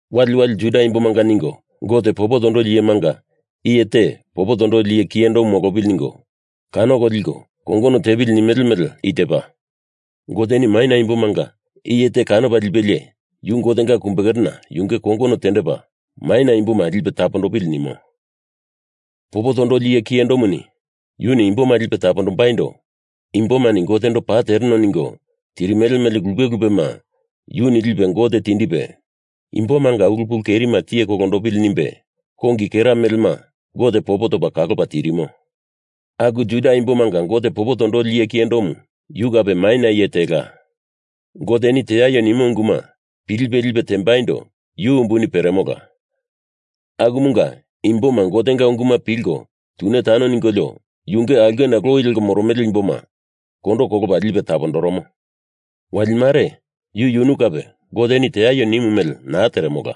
Wali wali Juda imbomanga ningo Gote popo tondoli iyemanga iye te popo tondoli iye kiyendomu molopili ningo, kanoko liko kongono tepili nimele mele i tepa. Goteni maina imbomanga iye te kanopa lipelie yu Gotenga kumbekerena yunge kongono tendepa maina imboma lipe tapondopili nimo. Popo tondoli iye kiyendomu yuni imboma lipe tapondombaindo imbomani Gotendo paa tereno ningo tirimele mele lupe lupema yuni lipe Gote tindipe, imbomanga ulu pulu kerima tiye kolondopili nimbe kongi kera melema Gote popo topa kalopa tirimo. Aku Juda imbomanga Gote popo tondoli iye kiyendomu yu kape maina iye tela. Goteni teaio nimo unguma pilipe lipe tembaindo yu umbuni peremola, akumunga imboma Gotenga unguma pilko tune tane ningolio yunge aulkena loi leko moromele imboma kondo kolopa lipe tapondoromo. Wali mare yu yunu kape Goteni teaio nimu mele naa teremola.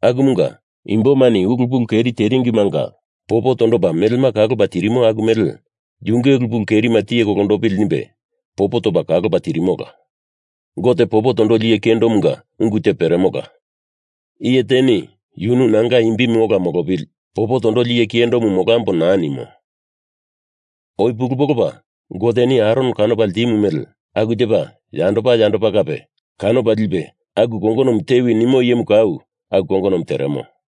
Akumunga imbomani ulu pulu keri teringimanga popo tondopa melema kalopa Gote tirimo aku mele yunge ulu pulu kerima tiye kolondopili nimbe popo topa kalopa tirimola. Gote popo tondoli iye kiyendomunga ungu te peremola. Iye teni yunu nanga imbimu ola molopili, popo tondoli iye kiyendo molambo naa nimo. Oi pulu polopa Goteni Aron kanopa ltimu mele aku tepa yandopa yandopa kape kanopa lipe aku kongonomu tewi nimo iyemu kau aku kongonomu teremo.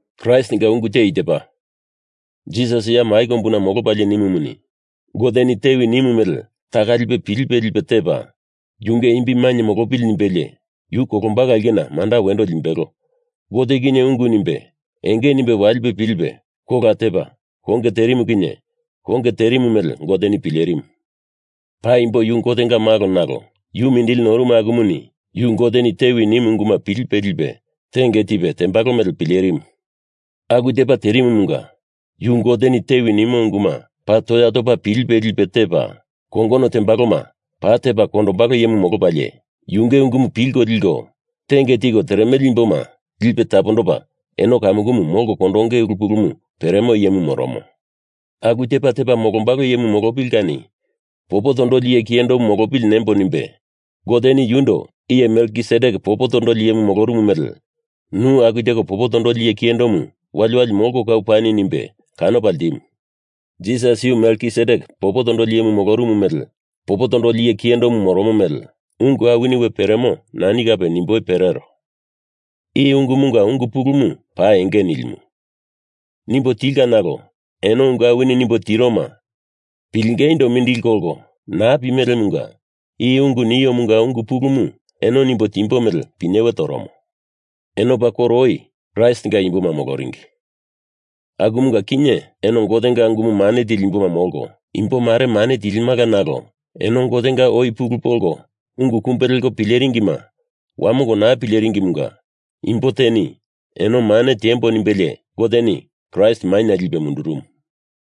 Kraistinga ungu te i tepa. Jisas ya mai kombuna molopalie nimumuni, Goteni tewi nimu mele taka lipe pilipe lipe tepa yunge imbi mainye molopili nimbelie yu kolombalo aulkena manda wendo limbelo Gote kinye ungu nimbe enge nimbe walipe pilipe kola tepa konge terimu kinye konge terimu mele Goteni pilerimu. Paimbo yu Gotenga Malo nalo yu mindili norumu akumuni yu Goteni tewi nimu unguma pilipe lipe tenge tipe tembalo mele pilerimu. Aku tepa terimumunga yu Goteni tewi nimo unguma paa toya topa pilipe lipe tepa, kongono timbeloma paa tepa kondombalo iyemu molopalie, yunge ungumu pilko liko tenge tiko teremele imboma lipe tapondopa eno kamukumu molko kondonge ulu pulumu peremo iyemu moromo. Aku tepa tepa molombalo iyemu molopili kani popo tondoli iye kiyendomu molopili nembo nimbe Goteni yundo iye Melkisedek popo tondoli iyemu molorumu mele nu aku teko popo tondoli iye kiyendomu wali wali molko kau pani nimbe kanopa ltimu. Jisas yu Melkisedek popo tondoli iyemu molorumu mele popo tondoli iye kiyendomu moromo mele ungu awini we peremo nimboindo nani kape perero. I ungumunga ungu pulumu paa enge nilimu. Nimbo tilka nalo eno ungu awini nimbo tiroma pilengeindo mindili kolko naa pimelemunga i ungu niomunga ungu pulumu eno nimbo timbo mele pinyewe toromo. Eno paa koro oi Kraistinga imboma moloringi, akumunga kinye eno Gotenga unguma mane tili imboma molko imbo mare mane tilimala nalo eno Gotenga oi pulu polko ungu pulu oi kumbe leko pileringima wamongo naa pimelemunga imbo teni eno mane tiembo nimbelie Goteni Kraist maina lipe mundurumu,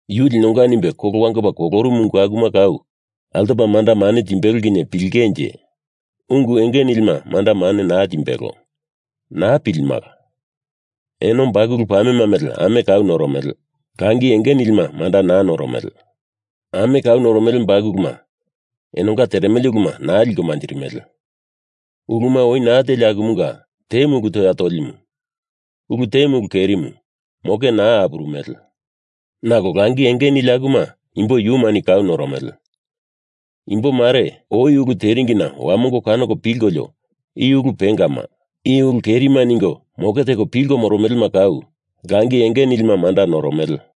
Yu linonga nimbe kolo wangopa kolorumu ungu akuma kau altopa manda mane timbelo kinye pilingenje ungu enge nilima manda mane naa timbelo. Naa pilimala. Eno bakulu pamema mele ame kau noromele, langi enge nilima manda naa noromele. Ame kau noromele bakuluma enonga teremele uluma naa liko manjirimele. Uluma oi naa teli akumunga temu ulu toya tolimu, ulu temu ulu kerimu moke naa apurumele. Nalo langi enge nili akuma imbo yumani kau noromele. Imbo mare oi ulu teringina wamongo kanoko pilkolio i ulu pengama, i ulu kerima ningo moke teko pilko moromelema kau langi enge nilima manda noromele.